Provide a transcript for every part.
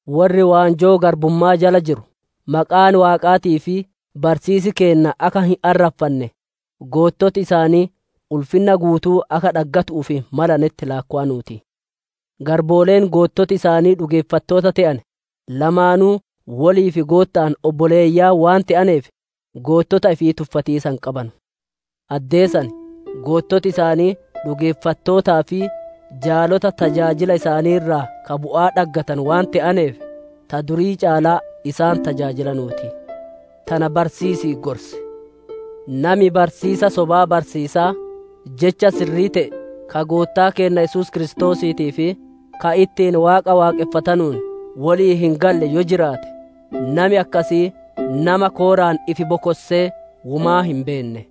Worri waanjoo garbumma'aa jala jiru maqaan Waaqaatii fi barsiisi keenna akka hin arraffanne, goottoti isaanii ulfinna guutuu akka dhaggatiisaaf malanetti laakkowanuu ti. Garbooleen goottoti isaanii dhugeeffattoota te'ane, lamaanuu woliif Gootta'aan obboleeyyan waan te'aneef, goottota ifii tuffatiisa hin qabanu. Addee san, goottoti isaanii dhugeeffattootaa fi jaalota tajaajila isaanii irraa ka bu'aa dhaggatanu waan te'aneef, ta durii caalaa isaan tajaajilanuu ti. Tana barsiisii gorsi. Nami barsiisa sobaa barsiisaa, jecha sirrii te'e ka Goottaa keenna Yesuus Kiristoosiitii fi ka ittiin Waaqa waaqonfatanuun wolii hin galle yoo jiraate, nami akkasii nama kooraan ifi bokossee womaa hin beenne.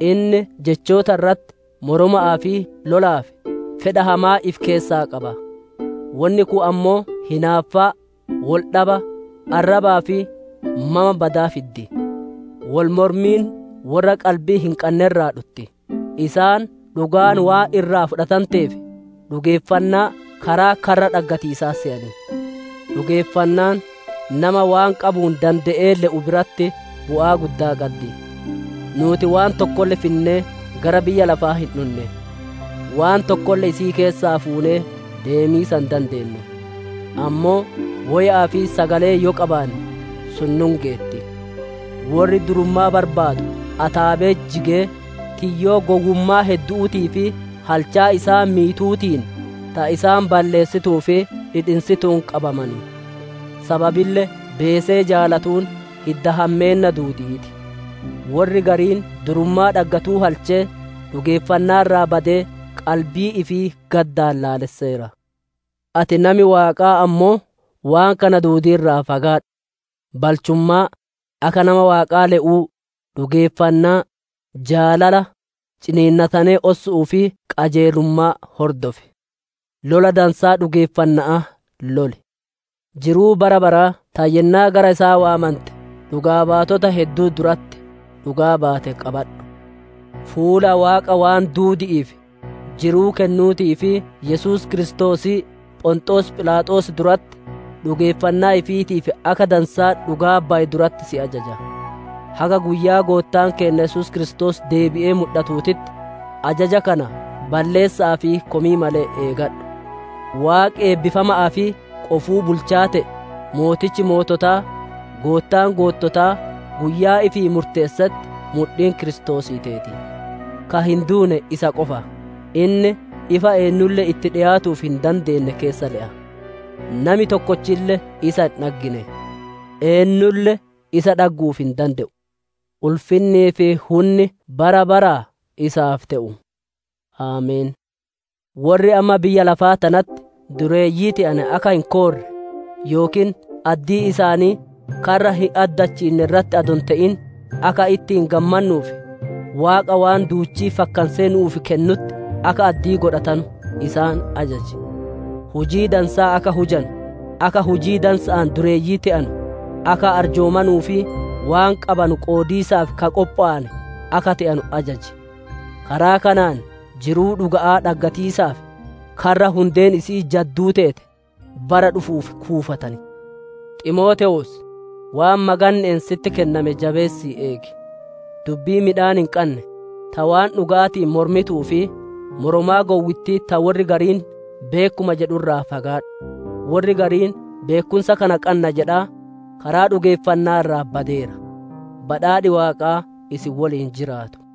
Inni jechoota irratti moroma'aa fi lolaaf fedha hamaa ifi keessaa qaba. Wonni kun ammoo hinaaffaa, wol dhaba, arrabaa fi mama badaa fiddi. Wol mormiin worra qalbii hin qanne irraa dhutti, isaan dhugaan waan irraa fudhatanteef dhugeeffannaa karaa karra dhaggatiisaa seyan. Dhugeeffannaan, nama waan qabuun dande'ee le'u biratti bu'aa guddaa qaddi. Nuuti waan tokkolle finnee gara biyya lafaa hin dhunne; waan tokkolle isii keessaa fuunee deemiisa hin dandeennu. Ammoo woya'aa fi sagalee yoo qabaanne sun nu hin geetti. Worri durummaa barbaadu ataabe'etti jigee, tiyyoo gowwummaa heddu'uutii fi halchaa isaan miituutiin, ta isaan balleessituu fi dhidhinsituun qabaman. Sababille beesee jaalatuun hidda hammeenna duudi'ii ti. Worri gariin durummaa dhaggatuu halchee, dhugeeffannaa irraa badee qalbii ifii gaddaan laalesseera. Ati nami Waaqaa ammoo, waan kana duudii irraa fagaadhu; balchummaa, akka nama Waaqaa le'uu, dhugeeffannaa, jaalala, ciniinnatanee ossu'uu fi qajeelummaa hordof. Lola dansaa dhugeeffanna'aa loli. Jiruu bara baraa ta yennaa gara isaa waammante dhugaa baatota hedduu duratti dhugaa baate qabadhu. Fuula Waaqa waan duudi'iif jiruu kennuutii fi Yesuus Kiristoosii Phonxoos Philaaxoos duratti dhugeeffannaa ifiitiif akka dansaa dhugaa baye duratti si ajaja. Haga guyyaa Goottaan keenna Yesuus Kiristoos deebi'ee mudhatuutitti ajaja kana balleessa'aa fi komii malee eegadhu. Waaqi eebbifama'aa fi qofuu Bulchaa te'e, Mootichi moototaa, Goottaan goottotaa guyyaa ifii murteessetti mudhiin Kiristoosii teeti. Ka hin duune isa qofa; inni ifa eennulle itti dhiyaatu'uuf hin dandeenne keessa le'a. Nami tokkolle isa hin dhaggine; eennulle isa dhaggu'uuf hin dande'u. Ulfinnii fi hunni bara baraa isaaf te'u! Ameen. Worri amma biyya lafaa tanatti dureeyyii te'ane akka hin koorre, yookiin addii isaanii karra hin addachiinne irratti adoo hin te'in, akka ittiin gammannuuf Waaqa waan duuchii fakkansee nu'uuf kennutti akka addii godhatanu isaan ajaji. Hujii dansaa akka hujanu, akka hujii dansa'aan dureeyyii te'anu, akka arjoomanuu fi waan qabanu qoodiisaaf ka qophowane akka te'anu ajaji. Karaa kanaan jiruu dhuga'aa dhaggatiisaaf karra hundeen isi'ii jadduu teete bara dhufuuf kuufatan. Ximootewoos! Waan maganne'een sitti kenname jabeessi eegi. Dubbii midhaan hin qanne, ta waan dhuga'aatiin mormituu fi moromaa gowwittii ta worri gariin «Beekkuma» jedhu irraa fagaadhu. Worri gariin beekkumsa kana qanna jedhaa, karaa dhugeeffanna'aa irraa badeera. Badhaadhi Waaqaa isin woliin jiraatu.